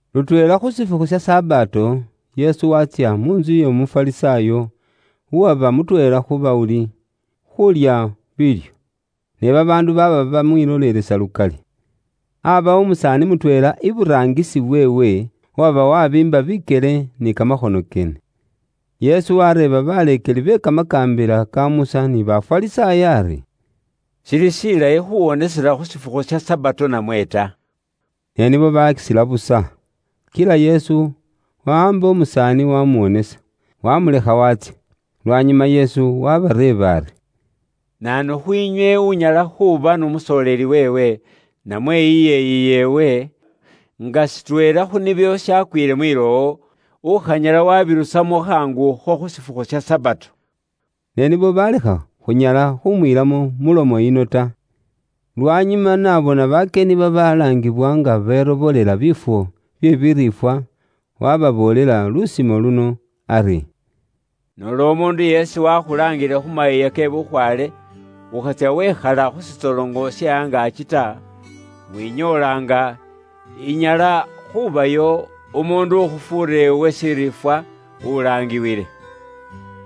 Lutweela khu shifukhu sha Sabato, Yesu waatsya mu ntsu y'Omufarisaayo, uwaba mutweela khu bawuli, khuulya biilyo. Ne babaandu baaba bamwilolelesa lukali. Aabawo umusaani mutweela iburaangisi weewe uwaba wabiimba bikyele ni kamakhono keene. Yesu wareeba baleekeli be Kamakaambila ka Musa ni Bafarisaayo ari, “Shili shilayi khuwonesela khu shifukhu sha Sabato namwe ta?” Ne nibo basila busa. Kila Yesu wawaamba umusaani wamuwonesa, wamulekha waatsya. Lwanyuma Yesu wabareeba ari, “Naanu khwiinywe unyala khuuba n'umusoleeli weewe, namwe iyeeyi yeewe, nga shitweela khu nibyo shakwiile mwilowo, ukhanyala wabirusamo khaangu akho khu shifukhu sha Sabato?” Ne nibo balekha khunyala khumwiilamo mu mulomo yino ta. Lwanyuma n'abona bakyeni babalaangiwa nga berobolela biifwo bye biriifwa, waababoolela lusimo luno ari: “Noola umuundu yeesi waakhulaangile khu mayiiya ke bukhwaale, ukhatsya wekhala khu shitsoloŋo she angaaki ta, winyoola nga inyala khuubayo umuundu ukhufuura iwe shiriifwa ulaangiwile.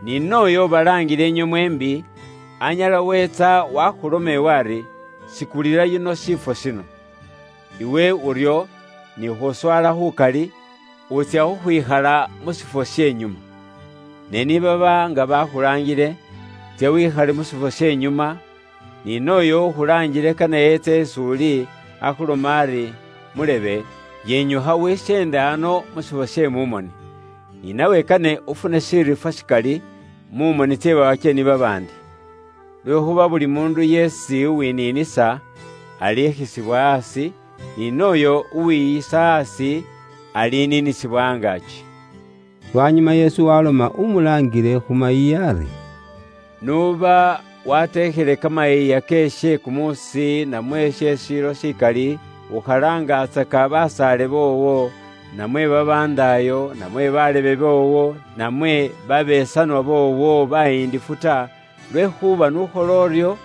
Ni nooyo ubalaangile inywe mweembi, anyala weetsa waakhuloma iwe ari, ‘Sikulila yuno shiifwo shino.’ Iwe uryo ni khuswala khukali, wutsya khukhwikhala mu shifwo she nyuma. Ne ni baba nga bakhulaangile, tsya wikhale mu shifwo she nyuma, ni nooyo ukhulaangile kane etse is'uli, akhulome ari, ‘Mulebe, yinyukha wisyende ano mu shifwo she mu moni.’ Ni nawe kane ufune shiriifwa shikali, mu moni tse bakyeni babaandi. Lwekhuuba buli muundu yeesi uwiniinisa, alikhisibwa aasi; ni nooyo uwiyisa aasi, aliniinisibwa angaaki.” Lwanyuma Yesu waloma umulaangile khu mayiiya ari, “N'uba wateekhele kamayiiya ke she kumuusi, namwe she ashilo shikali, ukhalaangatsaka basaale boowo, namwe babandaayo, namwe balebe boowo, namwe babesanwa boowo bayindifu ta, lwekhuuba n'ukhola uryo,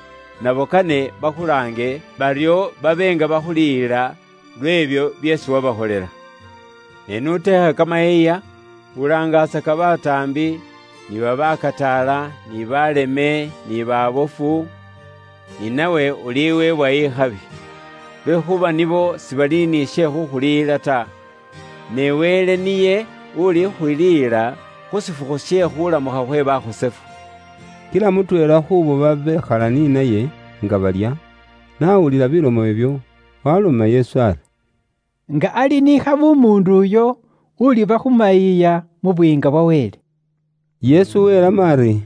nabo kane bakhulaange, baryo babe nga bakhuliyila, lw'ebyo byeesi wabakholela. Ne n'uteekha kamayiiya, ulaangatsaka bataambi, ni babaakataala, ni baaleme, ni baabofu, ni nawe uliweebwa ikhabi. Lwekhuuba nibo sibali ni she khuukhuliyila ta, ne Wele niye ulikhuliyila khu shifukhu she khuulamukha khwe bakhosefu.” Kila mutweela khuubo babekhala ni naye nga balya, n'awulila bilomo ibyo, waaloma Yesu ari, “Nga ali ni khabi umuundu uyo uliba khu mayiiya mu Buyiinga bwa Wele.” Yesu welamo ari,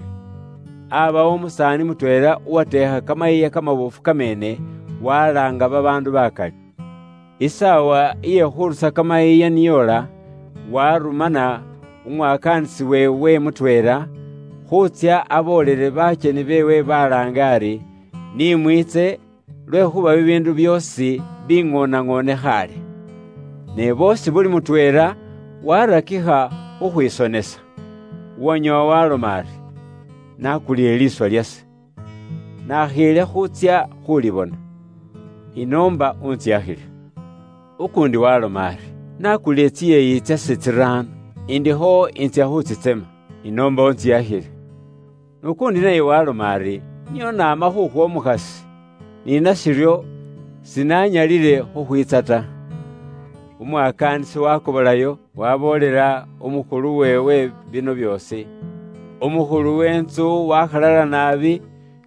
“Aabawo umusaani mutweela uwateekha kamayiiya kamaboofu kameene, walaanga babaandu bakali. Isaawa iye khurusa kamayiiya ni yoola, waarumana umwakaanisi weewe mutweela, khuutsya aboolele bakyeni beewe baalaange ari, ‘Ni mwiitse, lwekhuuba bibiindu byoosi biŋooneŋoone khaale.’ “Ne boosi buli mutweela waarakikha khukhwisonesa. Uwanyoowa waaloma ari, ‘Nakulile liiswa lyase, nakhiile khuutsya khuulibona. Inoomba untsiyakhile.’ Ukuundi waaloma ari, ‘Nakulile tsiyeeyi tsase tsiraano, indikho intsya khutsitsema. Inoomba untsiyakhile.’ N'ukuundi naye waaloma ari, ‘Nio naama khukhwa umukhasi, ni nashiryo, sinanyalile khukhwiitsa ta.’ “Umwakaanisi waakobolayo, waaboolela umukhulu weewe bino byoosi. Umukhulu we intsu waakhalala naabi,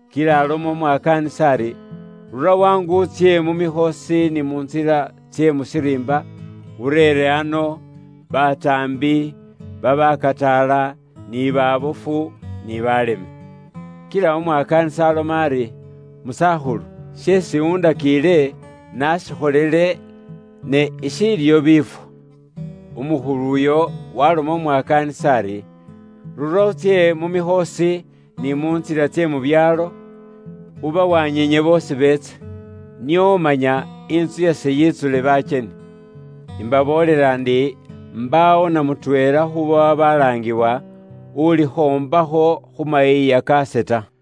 kila aloma umwakaaanisi ari, ‘Rura khaangu utsye mu mikhoosi ni mu ntsila tse mu shiriimba, ureere ano, bataambi, babakataala, ni baabofu, ni baaleme.’ Kila umwakaanisi aloma ari, ‘Musakhulu, sheesi undakiile naashikholile ne ishiliyo biifwo.’ “Umukhulu uyo waaloma umwakaanisi ari, ‘Rura utsye mu mikhoosi, ni mu ntsila tse mu byaalo, ubawanyiinye boosi beetse, nio manya intsu yase yitsule bakyeni. Imbaboolela ndi, mbaawo na mutweela khuubo babaalaangiwa, ulikhoombakho khu mayiiya kaase ta.’”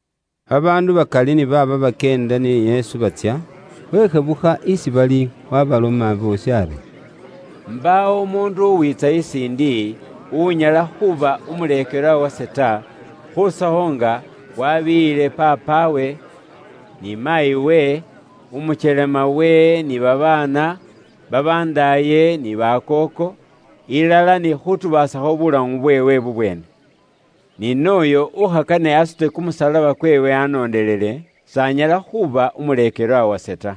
Babaandu bakali ni baaba bakyeenda ni Yesu batsya, weshebukha isi bali waabaloma boosi ari, “Mbaawo umuundu uwiitsa isiindi, unyala khuuba umuleekelwa wase ta, khurusakho nga wabiiyiile paapawe, ni maayiwe, umukyelemawe ni babaana, babandaaye, ni bakooko; ilala ni khutubaasakho bulamu bweewe bubweene. Ni nooyo ukhakane asute kumusalaba kweewe anoondelele, s'anyala khuuba umuleekelwa wase ta.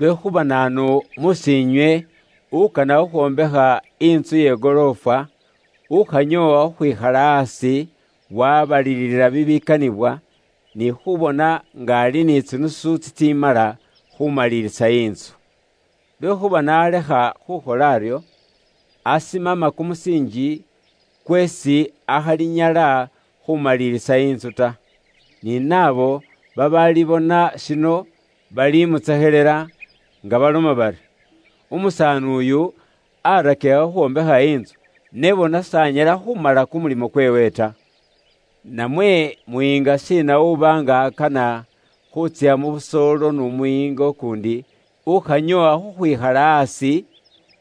Lwekhuuba naanu mus'iinywe ukana khukhwombekha intsu ye goroofwa, ukhanyoowa khukhwikhala aasi, wabalilila bibikanibwa, ni khubona nga ali ni tsinusu tsitsimala khumalilisa intsu? Lwekhuuba n'alekha khukhola aryo, asimama kumusiinji, kweesi akhalinyala khumalilisa intsu ta. Ni naabo babaalibona shino, balimutsekhelela, nga baloma bari, ‘Umusaani uyu, arakikha khukhwombekha intsu, ne bona s'anyala khumala kumulimo kweewe ta.’ “Namwe muyiinga shiina uba nga akana khuutsya mu busoolo n'umuyiinga ukuundi, ukhanyoowa khukhwikhala aasi,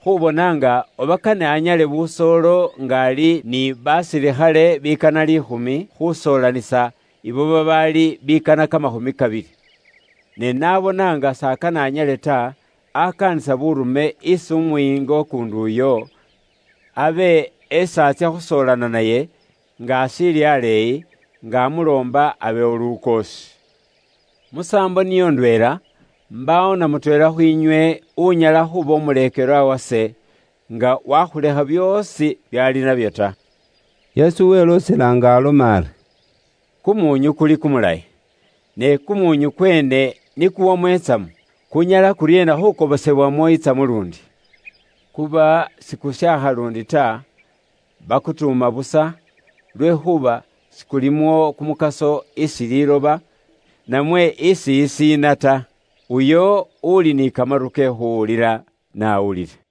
khubona nga oba kane anyale busoolo nga ali ni basilikhale bikana liikhumi, khusoolanisa ibo babaali bikana kamakhumi kabili? Ne n'abona nga s'akane anyale ta, akaanisa buurume isi umuyiinga ukuundi uyo, abe esi atsya khusoolana naye, nga ashiili aleeyi, nga amuloomba abewo lukoosi. Musaambo niyo ndweela, mbaawo na mutweela khwiinywe, unyala khuuba umuleekelwa wase, nga wakhulekha byoosi byaali nabyo ta.” Yesu weloosela nga aloma ari: “Kumuunyu kuli kumulayi, ne kumuunyu kweene ni kuwamo itsamu, kunyala kuryeena khuukobosebwamo itsamu luundi? Kuba sikushaakha luundi ta, bakutuuma busa, lwekhuuba sikulimo kumukaso isi liiloba namwe isi isiina ta. Uyo uuli ni kamaru ke khuuwulila, n'awulile.”